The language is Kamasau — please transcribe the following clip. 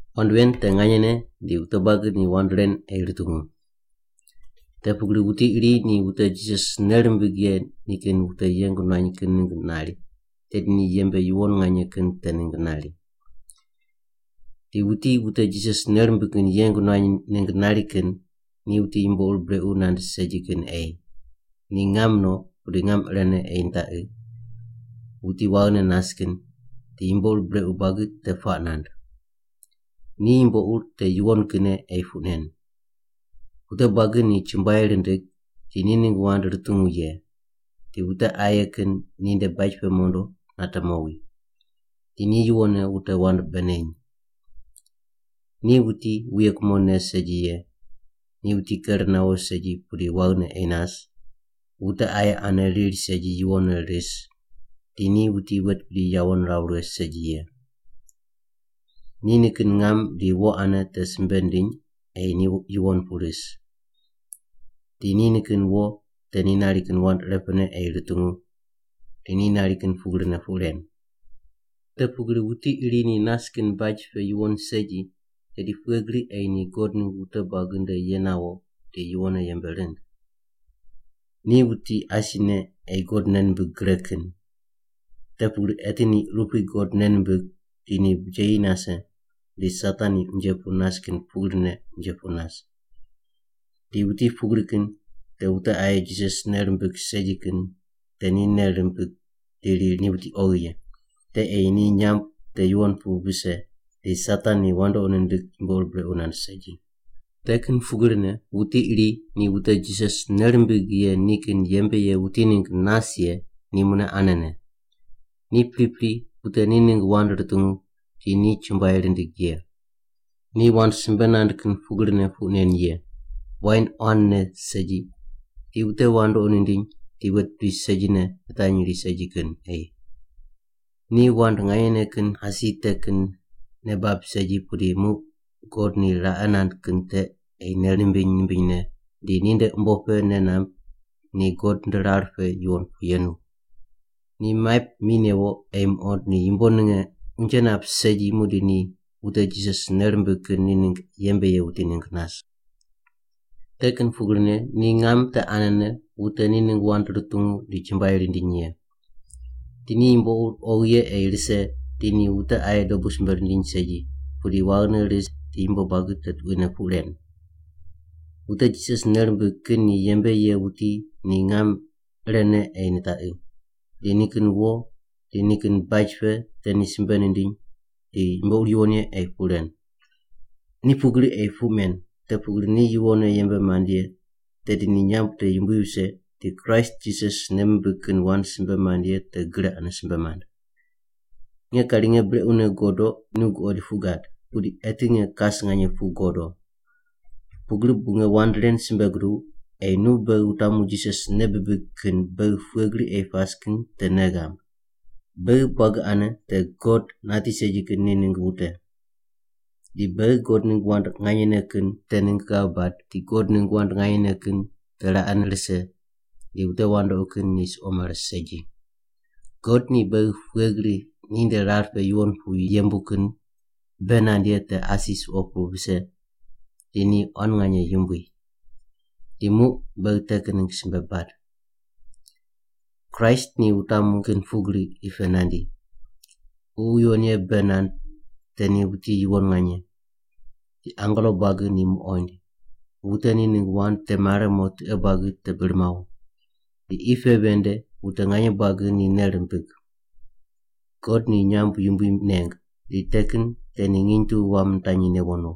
Wand ven te nganyene di wute buagi ni wand ren ei rutungu. Te pugri wuti iri ni wute Jisas nei rimbig ye ni kin wuti yeng nuany kin ningg nari tedi ni yembe yuwon nganye kin te ningg nari. Di wuti wute Jisas nei rimbig kin yeng nuany ningg nari kin ni wuti yumbo ur brequ nand segi kin ei, ni ngam no pudi ngam irene ei nitaqi, wuti waghine nas kin, di yumbo ur brequ buagi te puaq nand. Ni yumbo ur te yuwon kinne ei puq nen. Wute buagi ni chumbuai rindig di ni ningg wand rutungu ye, di wute aye kin ninde baj pe mondo nate mowi. Di ni yuwonne wute wand bei neny. Ni wuti wuye kumo ne segi ye, ni wuti ker nawo segi pudi waghine ei nas, wute aye ane riri segi yuwonne ris, di ni wuti wet bidi yawo niraw righe segi ye. Ni nikin ngam di wo ane te simbe nindiny ei ni yuwon pu ris, di ni nikin wo te ni nari kin wand irepene ei rutungu di ni nari kin pugrine puq ren. Te pugri wuti iri ni nas kin baj pe yuwon segi, tedi pughe gri ei ni God ningg wute buagi nde ye nawo di yuwonne yembe rind? Ni wuti asine ei God nei nimbig gre kin. Te pugri eti ni urupui God nei nimbig di ni bijeyi nase di Satan ni unje pu nas kin pugrine unje pu nas. Di wuti pugri kin te wute aye Jisas nei rimbig segi kin te ni nei rimbig di riri ni wuti oghi ye. Te ei ni nyamb te yuwon pu vise di Satan ni wandoqi nindig yumbo ur brequ nand segi. Te kin pugrine wuti iri ni wute Jisas nei rimbig ye ni kin yembe ye wuti ningg nas ye ni mune anene: Ni pripri wute ni ningg wand rutungu di ni chumbuai rindig ye. Ni wand simbe nand kin pugrine puq nen ye, wain quan ne segi di wute wandoqi nindiny di wet bidi segine nitanyri segi kin ei. Ni wand nganyene kin asi te kin nei bab segi pudi muq God ni raqe nand kin te ei nei nimbiny nimbinyne di ninde umbo pe nei namb ni God nde rar pe yuwon pu yenu. Ni maip mi newo ei muqond ni yumbo ninge unje nap segi muqdi ni wute Jisas nei rimbig kin ni ningg yembe ye wuti ningg nas. Te kin pugrine ni ngam te anene wute ni ningg wand rutungu di chumbuai rindiny ye. Di ni yumbo ur oghi ye ei rise di ni wute aye dobu simbe rindiny segi, pudi waghine ris di yumbo buagi te tuquine puq ren. Wute Jisas nei rimbig kin ni yembe ye wuti ni ngam irene ei nitaqi, di nikin wo di nikin baj pe te ni simbe nindiny di yumbo ur yuwon ye ei puq ren. Ni pugri ei puq men, te pugri ni yuwonne yembe mand ye tedi ni nyamb te yumbui vise di Kraist Jisas nei mimbig kin wand simbe mand ye te gre ane simbe mand. Nge kari nge brequne godo nu guqoid puq gad, pudi eti nge kas nganye pu godo. Pugri bu nge wand ren simbe guduw ei nu beghi wutamu Jisas nei bibig kin beghi pughe gri ei pas kin te nei ghamb. Beghi buagi ane te God nati segi kin ni ningg wute. Di beghi God ningg wand nganyene kin te ningg ghav bad di God ningg wand nganyene kin te raqene rise di wute wandoqi kin ni suqo mare segi. God ni beghi pughe gri ninde rar pe yuwon pu yembu kin bei nand ye te asi suqo pu vise di ni quan nganye yumbui. Di muq beghi te kin ningg simbe bad. Kraist ni wutamu kin pugrine qi pe nandi. Ququ Yuwon Ye bei nand te ni wuti yuwon nganye. Di angelo buagi ni muqoind. Wute ni ningg wand te mare mo tiqe buagi te bir mawo. Di qi pe ven nde wute nganye buagi ni nei rimbig. God ni nyamb yumbui neng, di te kin te ni nginy tu wam nitanyi newo no.